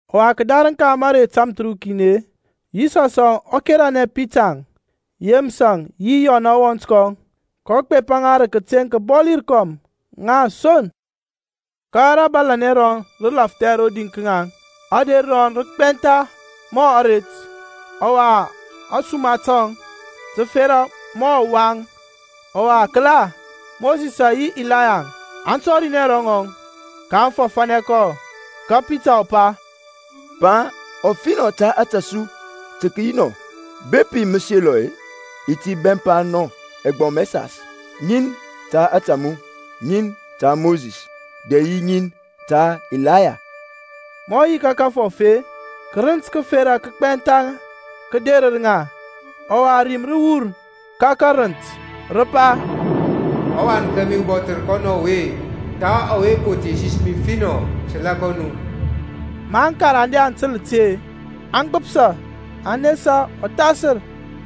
Ɔwa kǝdarǝŋ ka mǝrei tamthǝrukin-e, Yisɔsȧŋ ɔ keranɛ Pitarȧŋ, Yemǝsȧŋ yi Yɔnȧŋ ɔwɔnt kɔŋ, kɔ gbepa ŋa rǝ kǝteŋ kǝbɔli rǝkɔm, ŋa son. Ka rabalanɛ rɔŋ rǝ lafthɛ rodi ka ŋaŋ. Ader rɔŋ rǝ gbɛntha mɔ aret, ɔwa ȧsuma tɔŋ tǝ fera mɔ ɔwaŋ. Ɔwa kǝla, Mosisȧŋ yi Ilayaŋ aŋ tɔrinɛ ro ŋaŋ, kaŋ fɔfȧnɛ kɔ. Ka Pitȧŋ ɔ pa, Pa, ɔfinɔ ta ȧtȧ su tǝ kǝyi nɔ. Bepi mǝ selɔ-e, i ti bɛmpa nɔ ɛgbɔm ɛsas, ŋin ta ȧtȧ mu, ŋin ta Mosis, dɛ yi ŋin ta Ilaya. Ma ɔ yi ka kǝfɔf-e, kǝrǝnt kǝfera kǝgbɛntha kǝ derǝr ŋa; ɔwa rim rǝ wur ka karǝnt, rǝ pa, ƆWan kȧmi ubɔthǝr kɔnɔ ɔwe, ta ɔwe pǝ thesanɛ mi finɔ. Tǝla kɔ nu. Ma aŋkarande aŋ tǝl ti-e, aŋ gbǝpsa, aŋ nesa ɔthasǝr.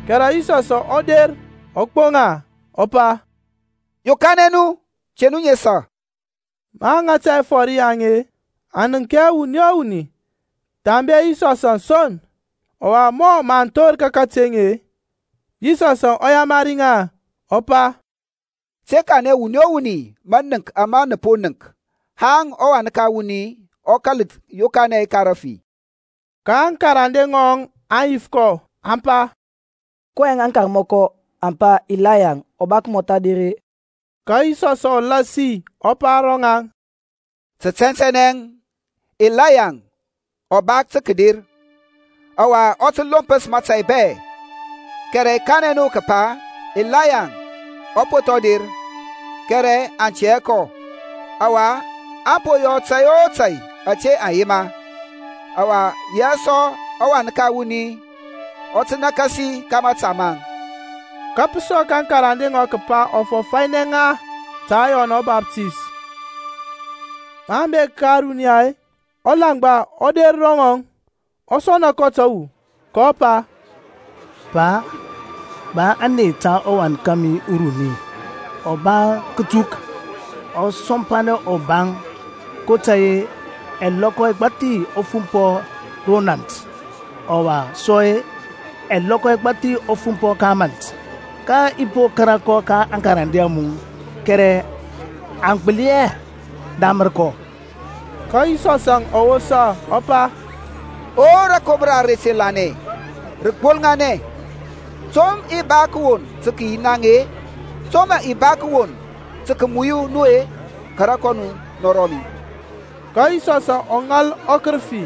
Kɛrɛ Yisɔsȧŋ ɔ der ɔ gboŋ ŋa, ɔ pa, Yokanɛ nu, te nu nesa. Maŋ ŋata ɛfɔr yaŋ-e, aŋ nənk hɛ wuni o wuni thambe Yisɔsȧŋ son. Ɔwa mɔ mǝ aŋ thor ka kateŋ-e, Yisɔs ɔ yamari ŋa, ɔ pa, Te kanɛ wuni o wuni mȧnǝnk ama nǝ po nənk haŋ ɔWan ka wuni ɔ kȧl yokanɛ ka rafi. Ka aŋkarande ŋɔŋ aŋ yif kɔ, aŋ pa, kɔyɛŋ aŋkarmɔkɔ aŋ pa Ilaya ɔ ba kǝmɔtha der-e? Ka Yisɔsȧŋ ɔ lasi ɔ pa ro ŋaŋ, Tǝ tɛntɛnɛ Ilaya ɔ ba tǝ kǝder, ɔwa ɔ tǝ lompǝs mətȧy bɛ. Kɛrɛ i kanɛ nu kǝpa, Ilaya ɔ po thɔŋ der, kɛrɛ aŋ tɛ hɛ kɔ, ɔwa aŋ po yɔ kɔ tȧy o tȧy ȧte aŋ yema. Ɔwa yaŋ sɔ ɔWan ka wuni ɔ tǝ nakasi ka mȧta maŋ. Ka pǝ sɔk aŋkarande ŋɔŋ kǝpa ɔ fɔfȧnɛ ŋa ta Yɔn ɔBaftays. Maŋ bek ka ȧruniya-e, ulaŋgba ɔ der ro ŋɔŋ, ɔ sɔna kɔ tǝwu, kɔ pa, Pa, ba ȧney ta ɔwan kȧmi uruni, ɔ ba kǝtuk, ɔ sɔmpanɛ ɔbaŋ, kotȧy-e ɛlɔkɔ ɛgbathi ɔ fumpɔ ro nȧnt, ɔwa sɔ-e, ɛlɔkɔ ɛgbathi ɔ fumpɔ ro mȧnt. Ka i po kȧrȧ kɔ ka aŋkarande a mu, kɛrɛ aŋ gbǝli hɛ damǝr kɔ. Ka Yisɔsȧŋ ɔ wosa ɔ pa, O rǝkomra ara te lanɛ, rǝgbolŋanɛ, to mǝ i ba kǝwon yi naŋ-e? To mǝ i ba kǝwon tǝ kǝmuyu nu-e? Kara kɔ nɔ ro mi. Ka Yisɔs ɔ ŋal ɔkǝrǝfi,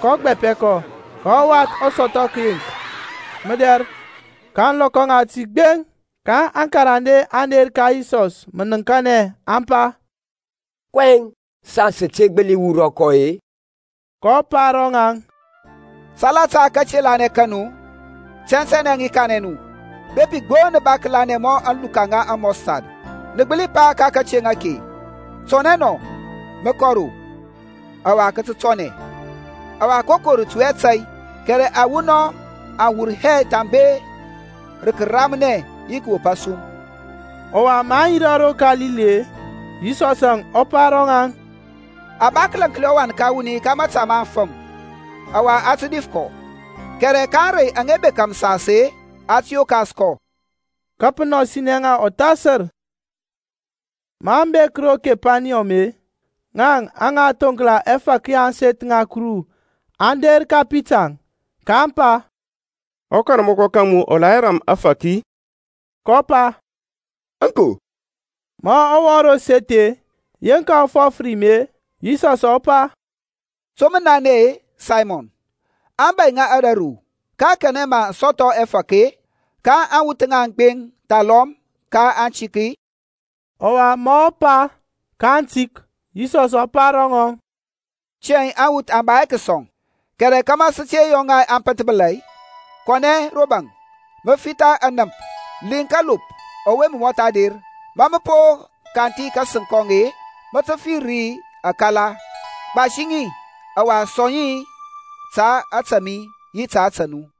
kɔ gbapɛ kɔ, ka ɔwath ɔ sɔthɔ kǝyeŋk mǝdɛr ka ȧŋlɔkɔ ŋati gbeŋ. Ka aŋkarande aŋ der ka Yisɔs mǝnǝŋkanɛ, aŋ pa, kɔyɛŋ saŋ sǝ te gbǝli wurɔ kɔ-e? kɔ pa ro ŋaŋ, Salata kate lanɛ ka nu. Tɛntɛnɛ i kanɛ nu, Bepi gbo nǝ ba kǝlanɛ mɔ aluka ŋa amustard nǝ gbǝli pa ka kateŋ ake, Tɔnɛ nɔ mǝ kɔ ro, ɔwa kǝ tǝ tɔnɛ. Ɔwa koko rǝ tui hɛ nu tȧy. Kɛrɛ awunɔŋ aŋ wur hɛ thambe rǝ kǝramnɛ yi kǝwop asum. Ɔwa maŋ yirȧ ro Kalili-e, Yisɔsȧŋ ɔ pa ro ŋaŋ, A ba kǝlaŋkli ɔWan ka wuni ka mȧta ma aŋfǝm, ɔwa aŋ tǝ dif kɔ, kɛrɛ ka ȧŋrey aŋa bekȧ mǝsas-e, a tǝ yokas kɔ. Ka pǝ nɔsinɛ ŋa ɔthasǝr. Maŋ bek ro Kepaniyɔm-e, ŋaŋ aŋa thoŋkla ɛfȧk ya ȧŋseth ŋa Kuru aŋ der ka Pita, kaŋ pa, Ɔkarmɔkɔ ka mu ɔ la hɛ ram ȧdiyɔ? kɔ pa, Aŋko. Ma ɔ wɔŋ ro seth-e yeŋka ɔ fɔf rim-e, Yisɔsȧŋ ɔ pa, To mǝ nanɛ-e, Saymɔn? aŋbȧy ŋa ȧdȧru-e ka kanɛ mǝ aŋ sɔthɔ ɛfȧk-e, ka aŋwuth ŋaŋ gbeŋ thalɔm ka atik-e? Ɔwa ma ɔ pa, Ka atik, Yisɔs ɔ pa ro ŋɔŋ, Tiyȧŋ aŋwuth aŋ ba hɛ kǝsɔŋ. Kɛrɛ kȧmȧ sǝ te yɔ ŋa aŋ pǝnthbǝla-e, kɔnɛ ro baŋ mǝ fitha anǝmp, liŋ kalop ɔwe mɔtha der. Ma mǝ po kanthi kasǝŋ kɔŋ-e mǝ tǝ fir ri akala. Gbasi ŋi ɔwa sɔŋ ŋa ta ȧtȧ mi yi ta ȧtȧ mu.